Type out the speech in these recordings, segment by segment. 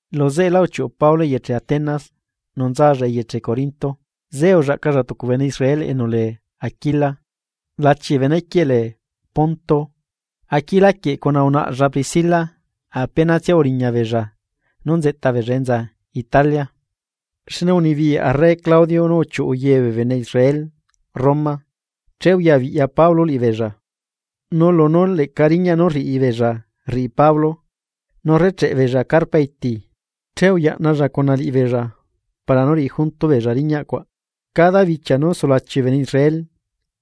Lu zeꞌela uchiuꞌu Pablo eyeche Atenas nu nzalla eyeche Corinto. Zeꞌe ullaꞌcalla tucu bene Israel enu lee Aquila, lachi bene quieꞌ lee Ponto. Aquila quieꞌ cuna unaꞌlla Priscila apenatsia uriña beella nú nzeꞌta beella enza Italia, xne unibiyaꞌ arre Claudio nú uchiuꞌu ye bee bene Israel Roma. Che uyabiꞌya Pablo liꞌibeella, nu lunú leꞌca riñaꞌ nú rriꞌibeella rriꞌi Pablo, nú rrecheꞌe beella carpa iti, che uyaꞌnalla cuna liꞌibeella para nú riꞌi junto beella riñaꞌ cuaꞌ. Cada bichia nú sulachi bee bene Israel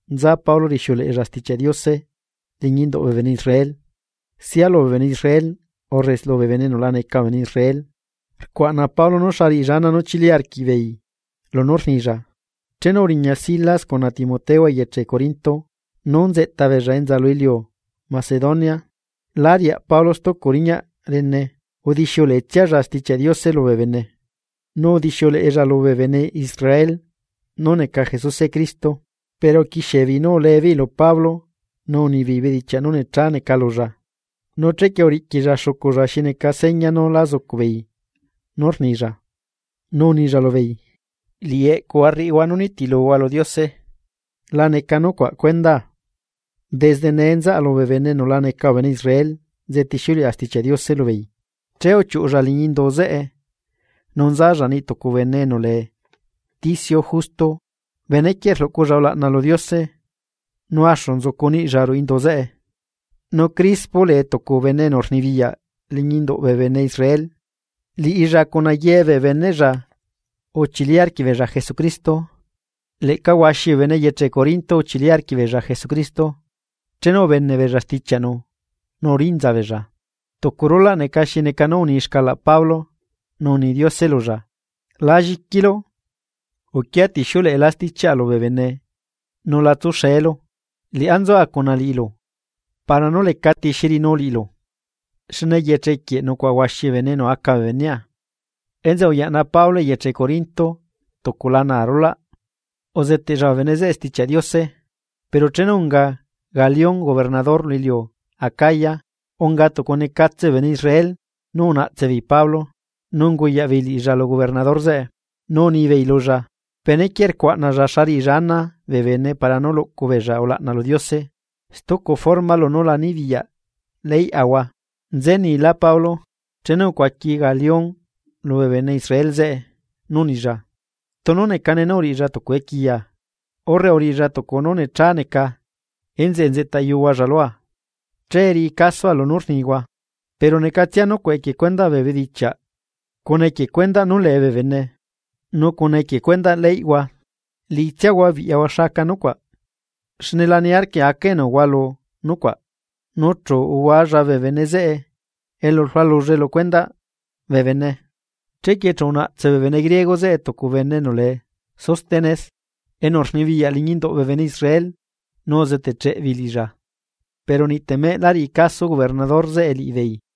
nza Pablo rixiuleꞌella Stichiaꞌ Diose liñi induꞌ bee bene Israel, sia lubee bene Israel urre lubee bene enu la neca bee bene Israel, rcuaꞌna Pablo xa riꞌilla ana nú chili arquiꞌbeei lunú rnilla. Chenu uriña Silas cuna Timoteo eyeche Corinto nú nzeꞌta beella enza lu iliu Macedonia lá riaꞌ Pablo stucu riñaꞌ rene udixiuleꞌetsialla Stichiaꞌ Diose lubee bene, nu udixiuleꞌella lubee bene Israel nú neca Jesuse Cristo. Pero uquixiebeei nú uleebeei lu Pablo nu unibeei bedichiaꞌ nú necha neca lulla, nu chequie uriꞌquilla xuculla xi neca seña nú la zucuꞌbeei nú rnilla, nu unilla lubeei: ―Liꞌi eꞌcuhua rriꞌihua nú nitiluhua lu Diose la neca nucuaꞌ cuenda. Desde nee nzaꞌa lubee bene enu la neca bee bene Israel nzetixiuleꞌa Stichiaꞌ Diose lubeei. Che uchiuꞌulla liñi indu zeꞌe nu nzalla niꞌ tucu bene enu lee Ticio Justo, benequieꞌ rluꞌculla ulaꞌna lu Diose nu axu nzucu niꞌlla ruꞌu indu zeꞌe. Nu Crispo lee tucu bene enu rnibiyaꞌ liñi induꞌ bee bene Israel, liꞌilla cuna ye bee beneꞌlla uchili arquiꞌbeella Jesucristo. Leꞌca huaxi bee bene eyeche Corinto uchili arquiꞌbeella Jesucristo chenu ubeneꞌbeella stichiaꞌnu nu urinza beella. Tucu rulaꞌ neca xi neca nú uni xcalaꞌ Pablo nu uni Diose lulla: ―La lliquilu uquia tixiuleꞌelá stichiaꞌa lubee bene nu la tsuxeelu, liꞌá nzua cuna liꞌilu para nú lecati xi riꞌinu liꞌilu, xne eyeche quieꞌ nucuaꞌa huaxi bee bene enu aca bee benea. Enzeꞌe uyaꞌna Pablo eyeche Corinto tucu lana arulaꞌ, uzeteꞌlla bee bene zeꞌe Stichiaꞌ Diose. Pero chenu unga Galión gobernador lu iliu Acaya, unga tucu necatse bee bene Israel nu unaꞌtse beei Pablo, nu unguyaꞌbeei liꞌilla lu gobernador zeꞌe. Nu unibeei lulla: ―Benequieꞌ rcuaꞌnalla xa riꞌilla ana bee bene para nú luꞌcu beella ulaꞌna lu Diose stucu forma lunú la nibiyaꞌ leyꞌahua. Nze nila Pablo, chenu ucuaqui Galión lubee bene Israel zeꞌe, nu unilla: ―Tunu necane nú uriꞌilla tucu equiya, urre uriꞌilla tucu nú necha neca enzeꞌe nzeꞌta yuhualla lua, che riꞌi casoa lunú rnihua. Pero necatsia nucuaꞌ equie cuendaꞌ bee bedichiaꞌ cuna equie cuendaꞌ nú lee bee bene, nu cuna equie cuendaꞌ leyꞌhua, liꞌitsiahua biꞌyahua xa aca nucuaꞌ, xne la niarquia aca enu hualu nucuaꞌ. Nu chu uhualla bee bene zeꞌe elu rlualullae lu cuendaꞌ bee bene. Chequie chu unaꞌtse bee bene griego zeꞌe tucu bene enu lee Sóstenes, enu rnibiyaꞌ liñi induꞌ bee bene Israel nu uzeteꞌcheꞌ beei liꞌilla. Pero niꞌtemeꞌ la riꞌi caso gobernador zeꞌe liꞌibeei.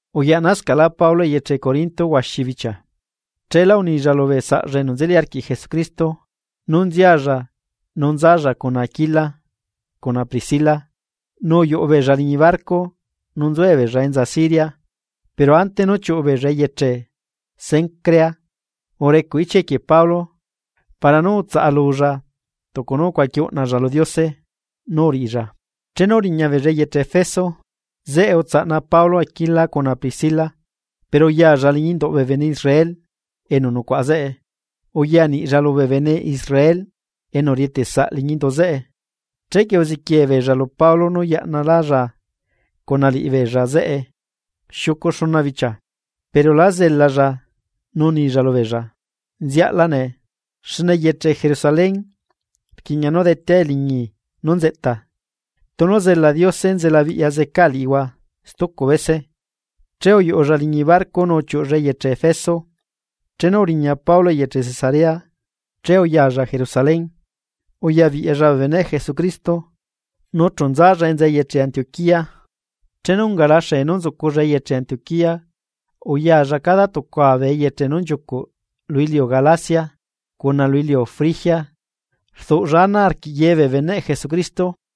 Uyaꞌnascaꞌlá Pablo eyeche Corinto huaxi bichia. Cheela unilla lubee saꞌlla enu nzeli arquiꞌ Jesucristo nú nzialla nu nzalla cuna Aquila cuna Priscila, nu uyuꞌu beella liñi barco nu nzuebeella enza Siria, pero ante nú chiuꞌu beella eyeche Cencrea urecuꞌ ichia equie Pablo para nú utsaꞌalulla tucu nú ucuaqui uꞌnalla lu Diose nú uriꞌilla. Chenu uriña beella eyeche Efeso, zeꞌe utsaꞌna Pablo Aquila cuna Priscila, pero uyalla liñi induꞌ bee bene Israel enu nucuaꞌa zeꞌe, uyaniꞌlla lubee bene Israel enu rieteꞌsaꞌ liñi indu zeꞌe. Chequie uziquiee beella lu Pablo nú yaꞌnalálla cuna liꞌibeella zeꞌe xiucu xuna bichia, pero lá zelalla, nu unilla lubeella: ―Nziaꞌla nee, xne eyeche Jerusalén rquiꞌña nú detea eliñi nú nzeꞌta. Tunu zela Diose nzelabiꞌya zeca liꞌihua stucu bese. Che uyuꞌulla liñi barco nu uchiuꞌulla eyeche Efeso. Chenu uriña Pablo eyeche Cesarea, che uyalla Jerusalén uyabiꞌyalla bee beneꞌ Jesucristo, nu chu nzalla enza eyeche Antioquía. Chenu ungala xee nú nzuculla eyeche Antioquía, uyalla cada tucua bee eyeche nú nchiucuꞌ lu iliu Galacia cuna lu iliu Frigia, rduꞌlla ana arquiꞌ ye bee beneꞌ Jesucristo.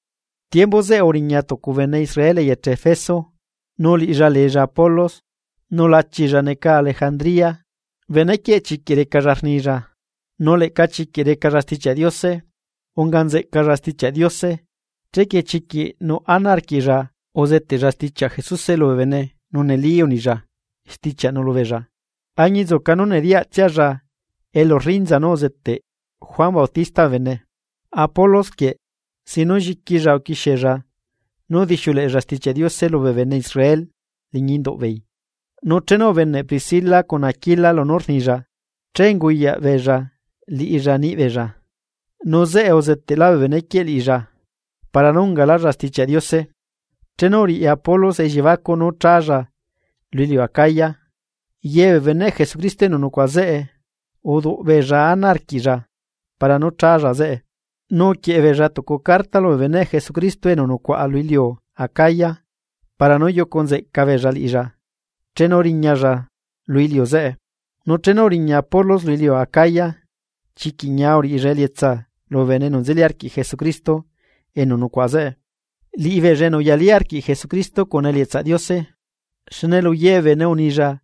Tiembu zeꞌe uriña tucu bene Israel eyeche Efeso nu liꞌilla leella Apolos, nu lachilla neca Alejandría. Benequieꞌ chiquiꞌ recalla rnilla, nu leꞌca chiquiꞌ recalla Stichiaꞌ Diose. Unga nzeꞌcalla Stichiaꞌ Diose, chequie chiquiꞌ nuꞌ ana arquiꞌlla uzeteꞌlla stichiaꞌ Jesuse lubee bene, nu neli unilla stichiaꞌnu lubeella, añinzuca nú nediyaꞌtsialla elu rrinza nú uzeteꞌ Juan Bautista bee bene. Apolos quieꞌ sin nú lliquilla uquixiella nú udixiuleꞌella Stichiaꞌ Diose lubee bene Israel liñi induꞌbeei, nu chenu ubeneꞌ Priscila cuna Aquila lunú rnilla, che unguyaꞌbeella liꞌilla niꞌbeella, nu zeꞌe uzeteꞌlá bee benequieꞌ liꞌilla para nú ungalallá Stichiaꞌ Diose. Chenu uriꞌi Apolos elliebacuꞌ nú chálla lu iliu Acaya, ye bee beneꞌ Jesucristo enu nucuaꞌa zeꞌe uduꞌ beella ana arquiꞌlla para nú challa zeꞌe, nu uquieꞌe beella tucu carta lubee beneꞌ Jesucristo enu nucuaꞌa lu iliu acaya para nú yucu nzeꞌca beella liꞌilla chenu riñalla lu iliu zeꞌe. Nu chenu uriña Apolos lu iliu Acaya chiquiꞌ uriꞌilla elietsa lubee bene enu nzeli arquiꞌ Jesucristo enu nucuaꞌa zeꞌe, liꞌibeella enu uyalí arquiꞌ Jesucristo cuna elietsaꞌ Diose. Xne lu ye bee bene unilla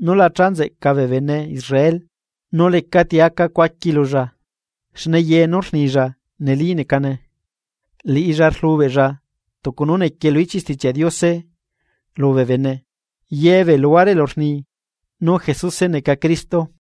nú la cha nzeꞌca bee bene Israel, nu lecati unga ucuaqui lulla, xne ye nú rnilla neli necane, liꞌilla rlubeꞌlla tucu nú nequie lu ichiꞌ Stichiaꞌ Diose lubee bene, ye bee luhuare elu rni: “Nú Jesuse neca Cristo.”